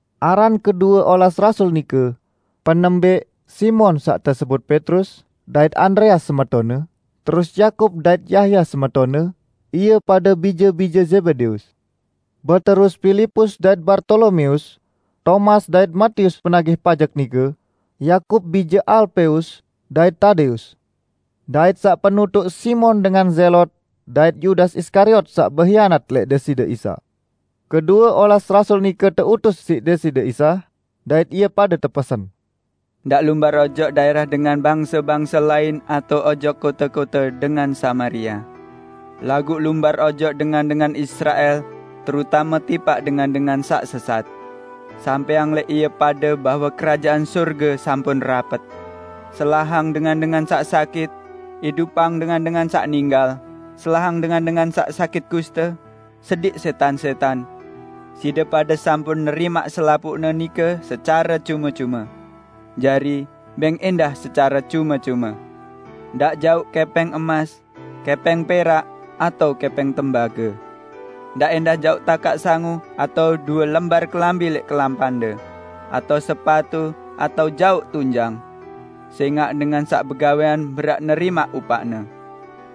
Aran kedue olas rasul nike: Penembẽq Simon (saq tesebut Petrus) dait Andreas semetonne, terus Yakub dait Yahya semetonne, ie pade bije-bije Zebedeus. Beterus Pilipus dait Bartolomeus, Tomas dait Matius penagih pajek nike, Yakub bije Alpeus, dait Tadeus; dait saq penutuq Simon dengan Zelot dait Yudas Iskariot saq behianat lẽq Deside Isa. Kedue olas rasul nike teutus siq Deside Isa, dait ie pade tepesen: "Ndaq lumbar ojok daẽrah dengan bangse-bangse lain atao ojok kote-kote dengan Samaria. Laguq lumbar ojok dengan-dengan Israel, terutame tipaq dengan-dengan saq sesat. Sampẽang lẽq ie pade bahwe Kerajaan Sorge sampun rapet. Selahang dengan-dengan saq sakit; idupang dengan-dengan saq ninggal; selahang dengan-dengan saq sakit kuste, sediq sẽtan-sẽtan. Side pade sampun nerimaq selapuqne nike secare cume-cume. Jari, bẽng ẽndah secare cume-cume. Ndaq jauq kẽpẽng emas, kẽpẽng perak atao kẽpẽng tembage. Ndaq ẽndah jauq takaq sangu atao due lembar kelambi lẽq kelampande, atao sepatu atao jauq tunjang. Sẽngaq dengan saq begawẽan berhak nerimaq upaqne.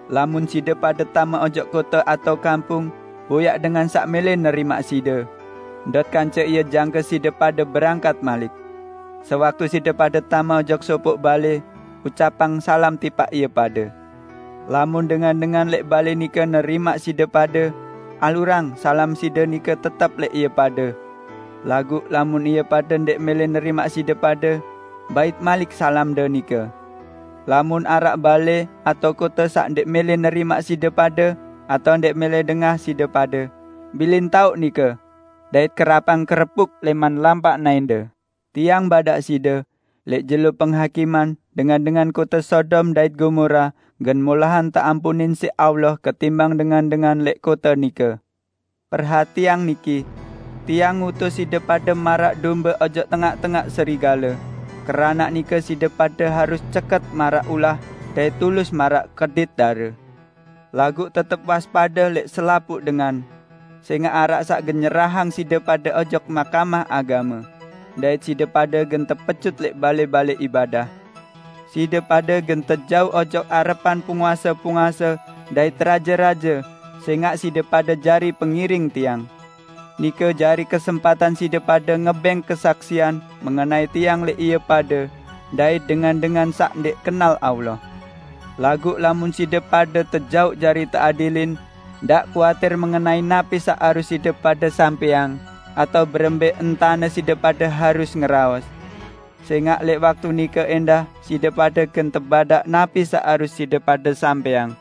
Lamun side pade tame ojok kote atao kampung, boyaq dengan saq mẽlẽ nerimaq side. Ndot kance ie jangke side pade berangkat malik. Sewaktu side pade tame ojok sopoq balẽ, ucapang salam tipaq ie pade. Lamun dengan-dengan lẽq balẽ nike nerimaq side pade, alurang salam side nike tetep lẽq ie pade. Laguq lamun ie pade ndẽq mẽlẽ nerimaq side pade, bait malik salamde nike. Lamun araq balẽ atao kote saq ndẽq mẽlẽ nerimaq side pade atao ndẽq mẽlẽ dengah side pade, bilin taoq nike, dait kerapang kerepuk lẽman naẽnde. Tiang badaq side: Lẽq jelo Penghakiman dengan-dengan kote Sodom dait Gomora gen molahan teampunin siq Allah ketimbang dengan-dengan lẽq kote nike!" "Perhatiang niki: Tiang ngutus side pade maraq dombe ojok tengaq-tengaq serigale, keranaq nike side pade harus ceket maraq ulah dait tulus maraq kedit dare. Laguq tetep waspade lẽq selapuq dengan, sẽngaq araq saq gen nyerahang side pade ojok mahkamah agame, dait side pade gen tepecut lẽq balẽ-balẽ ibadah. Side pade gen tejauq ojok arepan penguase-penguase dait raje-raje sẽngaq side pade jari pengiring Tiang. Nike jari kesempatan side pade ngebẽng kesaksian mengenai Tiang lẽq ie pade dait dengan-dengan saq ndẽq kenal Allah. Laguq lamun side pade tejauq jari teadilin, ndaq kuatir mengenai napi saq harus side pade ucapang, atao berembẽ entane side pade harus ngeraos. Sẽngaq lẽq waktu nike ẽndah side pade gen tebadaq napi saq harus side pade ucapang.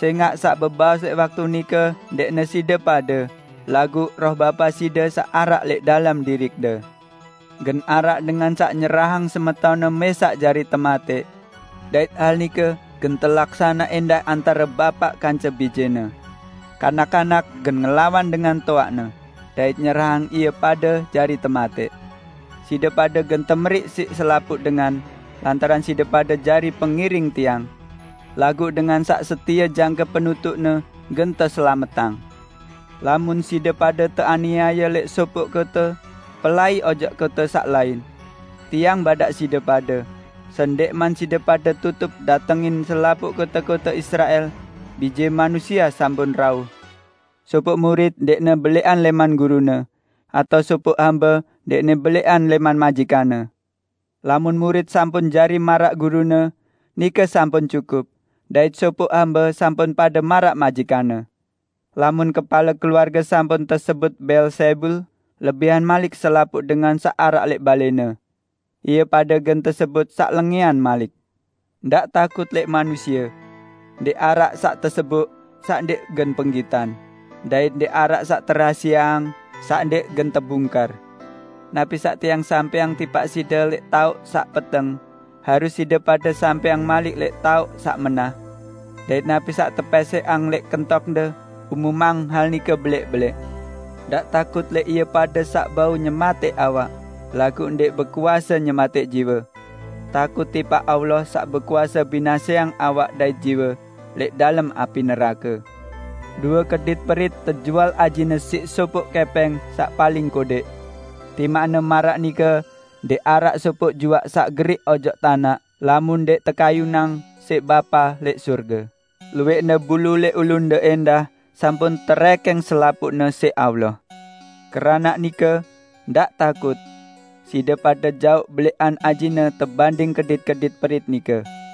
Sẽngaq saq bebaos lẽq waktu nike ndẽqne side pade laguq Roh Bapa side saq araq lẽq dalem diriqde. Gen araq dengan saq nyerahang semetonne mẽsaq jari tematẽq. Dait hal nike gen telaksane ẽndah antare bapaq kance bijene. Kanak-kanak gen ngelawan dengan toaqne dait nyerahang ie pade jari tematẽq. Side pade gen temeriq siq selapuq dengan lantaran side pade jari pengiring Tiang. Laguq dengan saq setie jangke penutuqne, gen teselametang. Lamun side pade teaniaye lẽq sopoq kote, pelai ojok kote saq lain. Tiang badaq side pade: Sendẽqman side pade tutuq datengin selapuq kote-kote Israel, Bije Manusie sampun rauh. Sopoq murit ndẽqne belẽqan lẽman gurune, atao sopoq hambe ndẽqne belẽqan lẽman majikanne. Lamun murit sampun jari maraq gurune, nike sampun cukup, dait sopoq hambe sampun pade maraq majikanne. Lamun kepale keluarge sampun tesebut Beelzebul, lebihan malik selapuq dengan saq araq lẽq balẽne. Ie pade gen tesebut saq lengẽan malik!" "Ndaq takut lẽq manusie. Ndẽq araq saq teseboq, saq ndẽq gen penggitan, dait ndẽq araq saq terahasieang saq ndẽq gen tebungkar. Napi saq Tiang sampẽang tipaq side lẽq taoq saq peteng, harus side pade sampẽang malik lẽq taoq saq menah. Dait napi saq tepẽsẽqang lẽq kentokde, umumang hal nike belẽq-belẽq! Ndaq takut lẽq ie pade saq bau nyematẽq awak, laguq ndẽq bekuase nyematẽq jiwe. Takut tipaq Allah saq bekuase binaseang awak dait jiwe lẽq dalem api nerake. Due kedit perit tejual ajine sopoq kẽpẽng saq paling kodẽq. Timaqne maraq nike ndẽq araq sopoq juaq saq geriq ojok tanaq lamun ndẽq tekayunang siq Bapa lẽq sorge. Luwẽqne bulu lẽq ulunde ẽndah sampun terẽkẽng selapuqne siq Allah. Keranaq nike, ndaq takut! Side pade jaoq belẽqan ajine tebanding kedit-kedit perit nike!"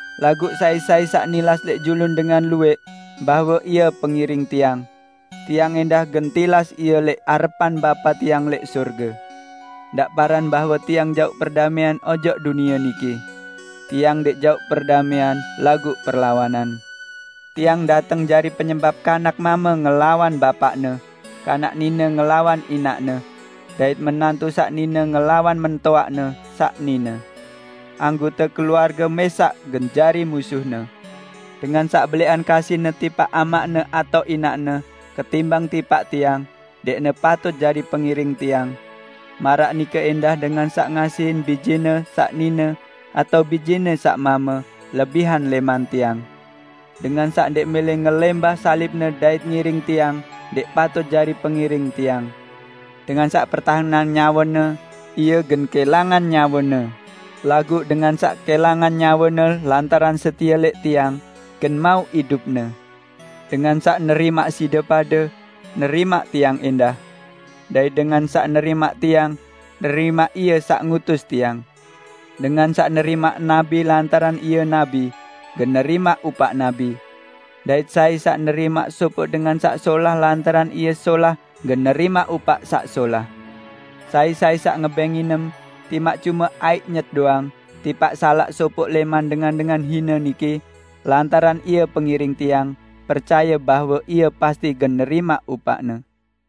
Laguq sai-sai saq nilas lẽq julun dengan luwẽq bahwe ie pengiring Tiang, Tiang ẽndah gen tilas ie lẽq arepan Bapa Tiang lẽq sorge." "Ndaq paran bahwe Tiang jauq perdamẽan ojok dunie niki. Tiang ndẽq jauq perdamẽan laguq perlawanan. Tiang dateng jari penyebap kanak mame ngelawan bapaqne, kanak nine ngelawan inaqne, dait menantu saq nine ngelawan mentoaqne saq nine. Anggote keluarge mẽsaq gen jari musuhne. Dengan saq belẽqan kasihne tipaq amaqne atao inaqne ketimbang tipaq Tiang, ndẽqne patut jari pengiring Tiang. Maraq nike ẽndah dengan saq ngasihin bijene saq nine atao bijene saq mame lebihan lẽman Tiang. Dengan saq ndẽq mẽlẽ ngelẽmbah salibne dait ngiring Tiang ndẽq patut jari pengiring Tiang. Dengan saq pertahenang nyawene, ie gen kẽlangan nyawene, laguq dengan saq kẽlangan nyawene lantaran setie lẽq Tiang, gen mauq idupne." "Dengan saq nerimaq side pade, nerimaq Tiang ẽndah. Dait dengan saq nerimaq Tiang, nerimaq Ie saq ngutus Tiang. Dengan saq nerimaq nabi lantaran ie nabi, gen nerimaq upaq nabi. Dait sai saq nerimaq sopoq dengan saq solah lantaran ie solah gen nerimaq upaq saq solah. Sai-sai saq ngebẽng nginem, timaq cume aiq nyet doang tipaq salaq sopoq lẽman dengan-dengan hine niki, lantaran ie pengiring Tiang, percaye bahwe ie pasti gen nerimaq upaqne!"